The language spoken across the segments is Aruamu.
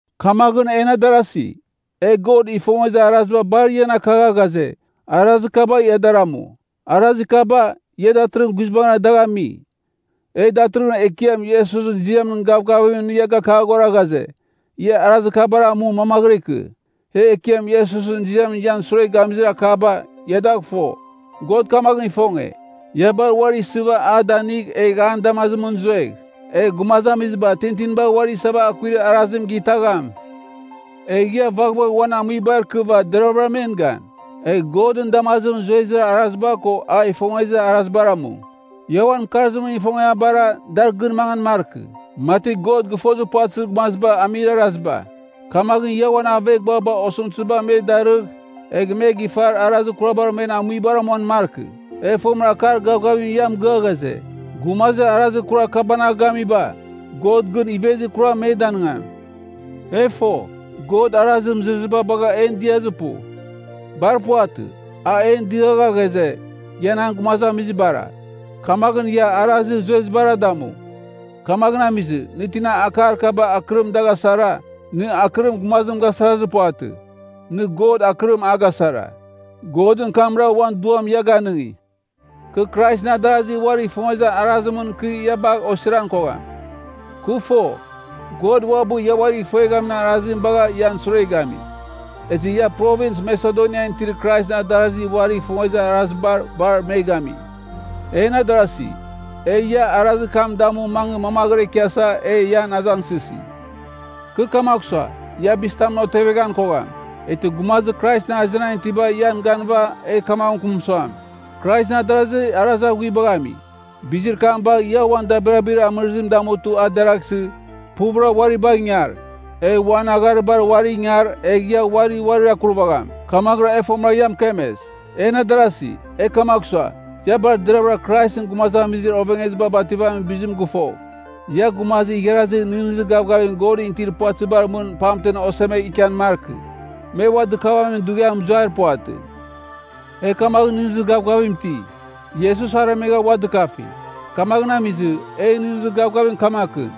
Kamaghɨn, en adarazi, e God ifongezir araziba bar ian akagha ghaze, arazir kaba ia dar amu. Arazir kaba, ia datɨrɨghɨn guizbangɨra dagh ami. E datɨrɨghɨn Ekiam Iesusɨn ziamɨn gavgavimɨn ia gakaghora ghaze, ia arazir kabar amu mamaghɨra ikɨ. E Ekiam Iesusɨn ziamɨn ian sure gamizir akaba, ia dagh fo. God kamaghɨn ifonge, ia bar uari isɨva a danigh egh an damazimɨn zuegh. Egh gumazamiziba tintinibar uari isava akuir arazim gitagham. Egh ia vaghvagh uan amuibar ikɨva deravɨra men gan. Egh Godɨn damazimɨn zuezir araziba ko a ifongezir arazibar amu. Ia uan mɨkarzimɨn ifongiabara, dar gɨn mangan markɨ, mati God gɨfozir puvatɨzir gumaziba amir araziba. Kamaghɨn ia uan aveghbuaba osɨmtɨziba me darɨgh egh me gifar arazir kurabar men amuibar amuan markɨ. E fomɨra akar gavgavim ia mɨgɨa ghaze, gumazir arazir kurar kabanagh gamiba, God gɨn ivezir kuram me danɨngam. E fo, God arazir mɨzɨrɨziba bagha en diazir pu. Bar puvatɨ. A en diagha ghaze, ia nan gumazamizibara, kamaghɨn ia arazir zuezibara damu. Kamaghɨn amizɨ, nɨ tina akar kaba akɨrim dagh asara, nɨ akɨrim gumazim gasarazir puvatɨ, nɨ God akɨrim a gasara, Godɨn kamra uan Duam ia ganɨngi. Kɨ Kraisɨn adarasi uarigh ifongezir arazimɨn kɨ ia bagh osiran kogham. Kɨ fo, God uabɨ ia uarigh ifueghamin arazim bagha ian sure gami. Ezɨ ia Provins Masedonian itir Kraisɨn adarasi uarigh ifongezir arazibar bar me gami. En adarasi, e ia arazir kam damu mangɨ mamaghɨra ikiasa e ian azangsɨsi. Kɨ kamagh sua, ia bizitamɨn oteveghan kogham, eghtɨ gumazir Kraisɨn azenan itiba ian ganɨva egh kamaghɨn mɨkɨm suam, Kraisɨn adarasi arazir aghuibagh ami. Bizir kam bagh ia uan dabirabir amɨrizim damutɨ a deraghsɨ, puvɨra uari bagh ingar. Egh uan agharibar uari ingar egh ia uari uarir akurvagham, kamaghɨra e fomɨra ia mɨkemes. En adarasi, e kamagh sua, ia bar deravɨra Kraisɨn gumazamizir ovengeziba bativamin bizim gɨfogh. Ia gumazir igharazir nɨghnɨzir gavgavim Godɨn itir puvatɨzibar mɨn pamten osemegh ikian markɨ. Me ua dɨkavamin dughiam mɨzuair puvatɨ. E kamaghɨn nɨghnɨzir gavgavim iti. Iesus aremegha ua dɨkafi. Kamaghɨn amizɨ, en nɨghnɨzir gavgavim kamaghɨn,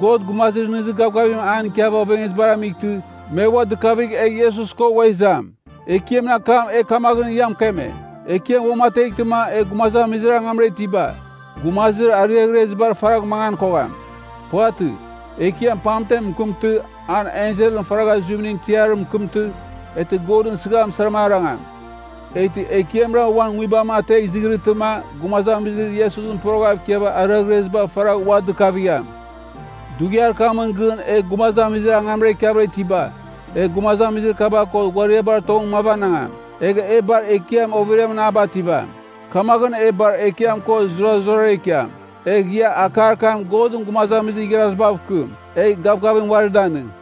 God gumazir nɨghnɨzir gavgavim an ikiava ovengezibar amightɨ, me ua dɨkavigh egh Iesus ko ua izam. Ekiamɨn akam e kamaghɨn ia mɨkeme, Ekiam uamateghtɨma e gumazamizir angamra itiba, gumazir ariaghrezibar faragh mangan kogham. Puvatɨ. Ekiam pamtem mɨkɨmtɨ, an enselɨn faragha zuimɨn tiarim mɨkɨmtɨ, eghtɨ Godɨn sɨgham sara arangam. Eghtɨ Ekiamra uan nguibam ategh izɨghɨrɨtɨma gumazamizir Iesusɨn poroghav ikiava ariaghreziba faragh ua dɨkavigham. Dughiar kamɨn gɨn e gumazamizir angamra ikiavɨra itiba, e gumazamizir kaba ko ghuariabar tongɨn mavanangam, egh e bar Ekiam overiamɨn a bativam. Kamaghɨn e bar Ekiam ko zurazurara ikiam. Egh ia akar kam Godɨn gumazamizir igharazibav kɨm, egh gavgavim uari danɨng.